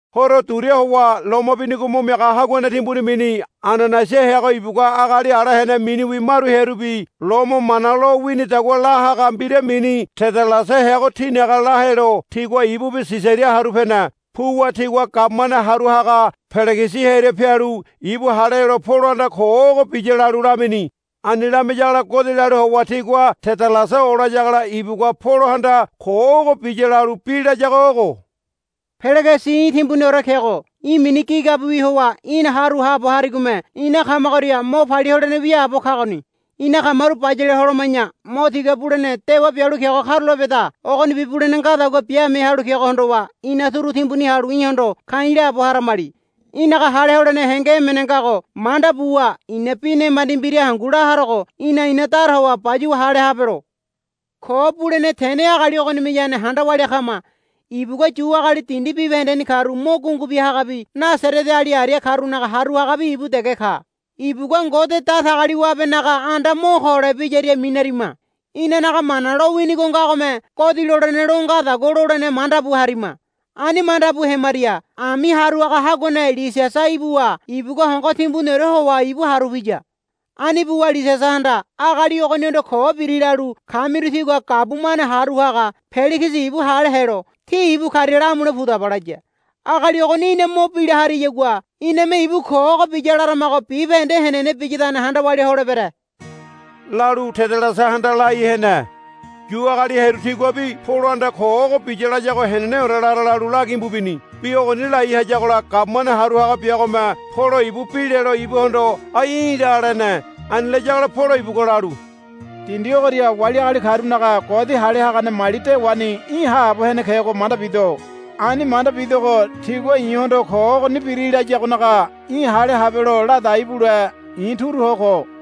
Horo duria howa loma binigo mo miaga haguane timbuni mini Ananaiasa heago ibugua agali ala hene miniwi maru hearubi Lomo mana lo winidagua la haga mbira mini Tedalasa heago tinaga la helo tigua ibubi Sisaria haru pene. Puwa tigua gabumane haru haga Peligisi hearia pialu ibu hale helo Polohanda ko ogo biya lalu lamini. Ani lamiyagola godi lalu howa tigua Tedalasa olayagola ibugua Polohanda ko ogo biya lalu bi layago ogo, Peligisi í̠ timbuniore kego. Í̠ mini gigabiwi howa ina haru haabo harigome ina kamagoria mo palia holene wiaabo kagoni. Ina kamaru bayale holoma̱ya mo tiga bulene dewa bialu kego karulapeda. Ogonibi bulene ngadagua biame halu kego hondowa ina turu timbuni halu í̠hondo ka̱i̱ laabo haramali. Í̠naga hale holene henge emene ngago manda buwa i̱na bi nemandi mbira hangu la harogo í̠na ina dara howa bayuwa hale habelo. Ko bulene tene agali ogonimeyane handa walia kama. Ibugua Yu agali dindi bibahendeni karu mo gungu bia hagabi Nasareteali aria karunaga haru hagabi ibu dege ka. Ibugua Ngode Datagaliwabenaga anda mo ko holebiyaria minarima. [Inanaga Mana lo winigo ngagome godi lolene lo ngadagua lolene manda bu harima. Ani manda bu hemaria ami haru haga haguane Lisiasa ibuwa ibugua hongo timbuniore howa ibu haru piya. Ani buwa Lisiasahanda, Agali ogonihondo ko biri lalu kamiru tígua gabumane haru haga Peligisi ibu hale helo tí ibu karia lamule pudaba, laya.] Agali ogoni í̠na mo bila hariyagua iname ibu ko ogo biya laramago bibahende henene biyadane handa walia holebere, lalu Tedalasahanda lai hene. Yu agali hearu tiguabi Polohanda ko ogoni biya layago heneneore lara lalu lagimbu bini. Bi ogoni lai hayagola gabumane haru haga biagome Polo ibu bi lelo ibuhondo, Ai í̠ la, lene. Ani layagola Polo ibugua lalu, Dindi ogoria wali agali karunaga godi hale hagane mali dewaoreni í̠ haabo hene kego manda bido. Ani manda bidogo tigua i̱hondo ko ogoni biri layagonaga í̠ hale habelo ladai bule i̱ turu ho ko.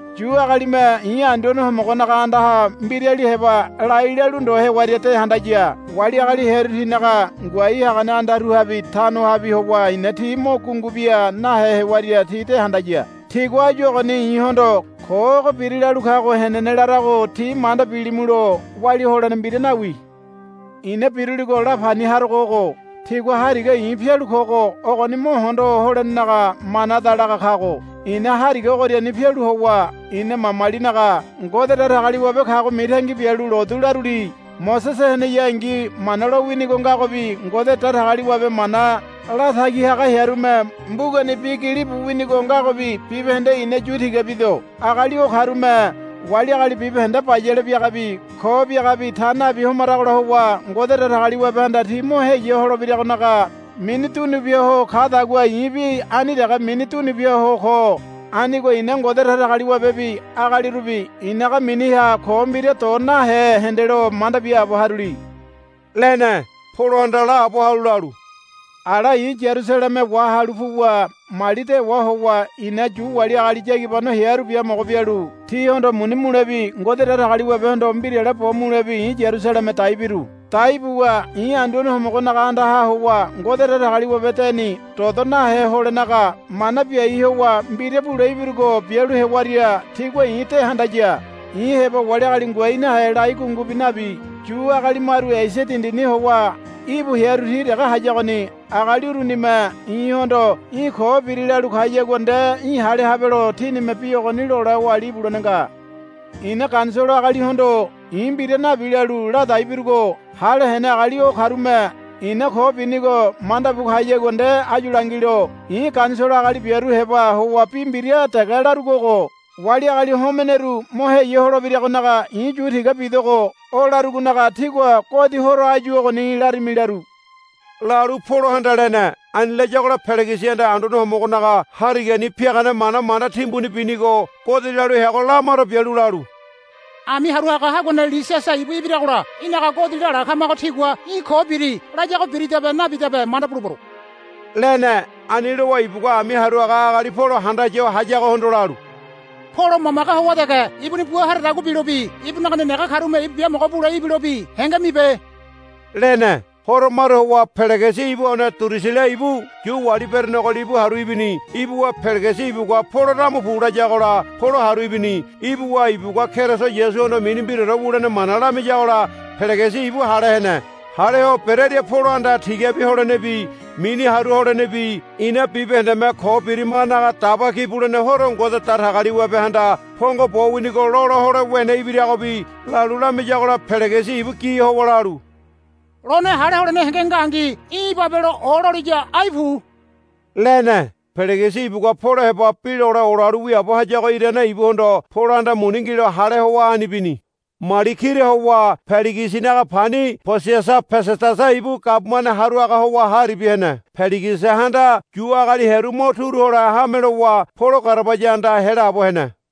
Yu agalime i̱ Anduane Homogonaga andaha mbirali heba lai lalu ndo hewaria de handaya. Wali agali hearu tinaga ngoai hagane andaruhabi tanohabi howa i̱na ti mo gungu bia nahe hewaria ti de handaya. Tigua áyu ogoni i̱hondo, Ko ogo biri, lalu kago henene larago tí manda bilimulo walia holene mbira nawi. I̱na biruligo la pani harogo ogo. Tigua Hariga i̱ pialu kogo ogoni mo hondo holenaga manada laga kago. I̱na Hariga ogoriani pialu howa ina mamalinaga Ngode Datagaliwabe kago mitangi bialu lotu laruli. Mosese heneyangi Mana lowinigo ngagobi Ngode Datagaliwabe mana latagi haga hearume mbugani bi gili bu winigo ngagobi bibahende i̱na yu tiga bido. Agali o karume wali agali bibahende bayale biagabi ko biagabi ta nabi homaragola howa Ngode Datagaliwabehanda ti mo heya holebiragonaga mini dunu bia ho kadagua i̱bi ani dege mini dunu bia ho ko. Anigo i̱na Ngode Datagaliwabebi agalirubi i̱naga miniha ko mbira do nahe hendelo manda biaabo haruli, lene. Polohanda laabo halu lalu, Ala i̱ Yarusaleme wahalu puwa mali dewa howa i̱na Yu wali agali yagibano hearu biamogo bialu tihondo muni mulebi Ngode Datagaliwabehondo mbirale bo mulebi i̱ Yarusaleme dai biru. Dai buwa i̱ Anduane Homogonaga andaha howa Ngode Datagaliwabe deni dodo nahe holenaga mana biai howa mbira bule ibirugo bialu hewaria tigua i̱ de handaya. I̱ heba wali agali ngoai nahe lai gungubi nabi. Yu agali maru Esia dindini howa íbu hearu ti dege hayagoni. Agali urunime i̱hondo, Í̠ ko biri, lalu kayagua nde í̠ hale habelo tinime bi ogoni lole oali ibulene nga. I̱na Ganisolo agalihondo, I̱ mbira nabi, lalu ladai birugo hale hene agali o karume i̱na ko binigo manda bu kayagua nde áyu langilo. I̱ Ganisolo agali biaru heba howa bi mbira dege larugo ogo, Wali agali homeneru mo heya holebiragonaga i̱ yu tiga bidogo, o larugonaga tígua godi horo áyu ogoni larimi laru, lalu Polohanda lene. Ani layagola Peligisihanda Anduane Homogonaga Harigani piagane mana manda timbuni binigo godi lalu heago lamaro bialu lalu, Ami haru haga haguane Lisiasa ibu ibiragola í̠naga godi lala kamago tigua, Í̠ ko biri, layago biridabe nabidabe manda bulebero, lene. Ani lowa ibugua ami haru haga agali Polo handaya ho hayagohondo lalu, Polo mamage howa dege ibuni bua haradagua bilobi ibunaga nenege karume ibu biamogo bule ibilobi henge mibe, lene. Horo maru howa Peligisi ibu one Durusila ibu Yu wali berenego libu haru ibini. Ibuwa Peligisi ibugua, Polo damu pu, layagola Polo haru ibini, Ibuwa ibugua Keriso Yasuhondo mini mbiraore wulene mana lamiyagola Peligisi ibu hale hene. Hale ho berearia Polohanda tigabi holenebi mini haru holenebi ina bibahendeme ko birimagonaga Daba Ki Bulene Horo Ngode Datagaliwabehanda pongo bo winigo lola hole wene ibiragobi lalu lamiyagola Peligisi ibu gi howa lalu, Lone hale holene henge ngangi í̠ ibabelo ololiya ai pu, lene. Peligisi ibugua Polo heba bi lole olalu wiaabo hayago irane ibuhondo Polohanda muni ngilo hale howa ani bini. Mali kira howa Peligisinaga pani Posiasa Pesedasa ibu gabumane haru haga howa ha aribia hene. Peligisihanda Yu agali hearu mo turu hole hame lowa Polo garabaya andaha helaabo hene.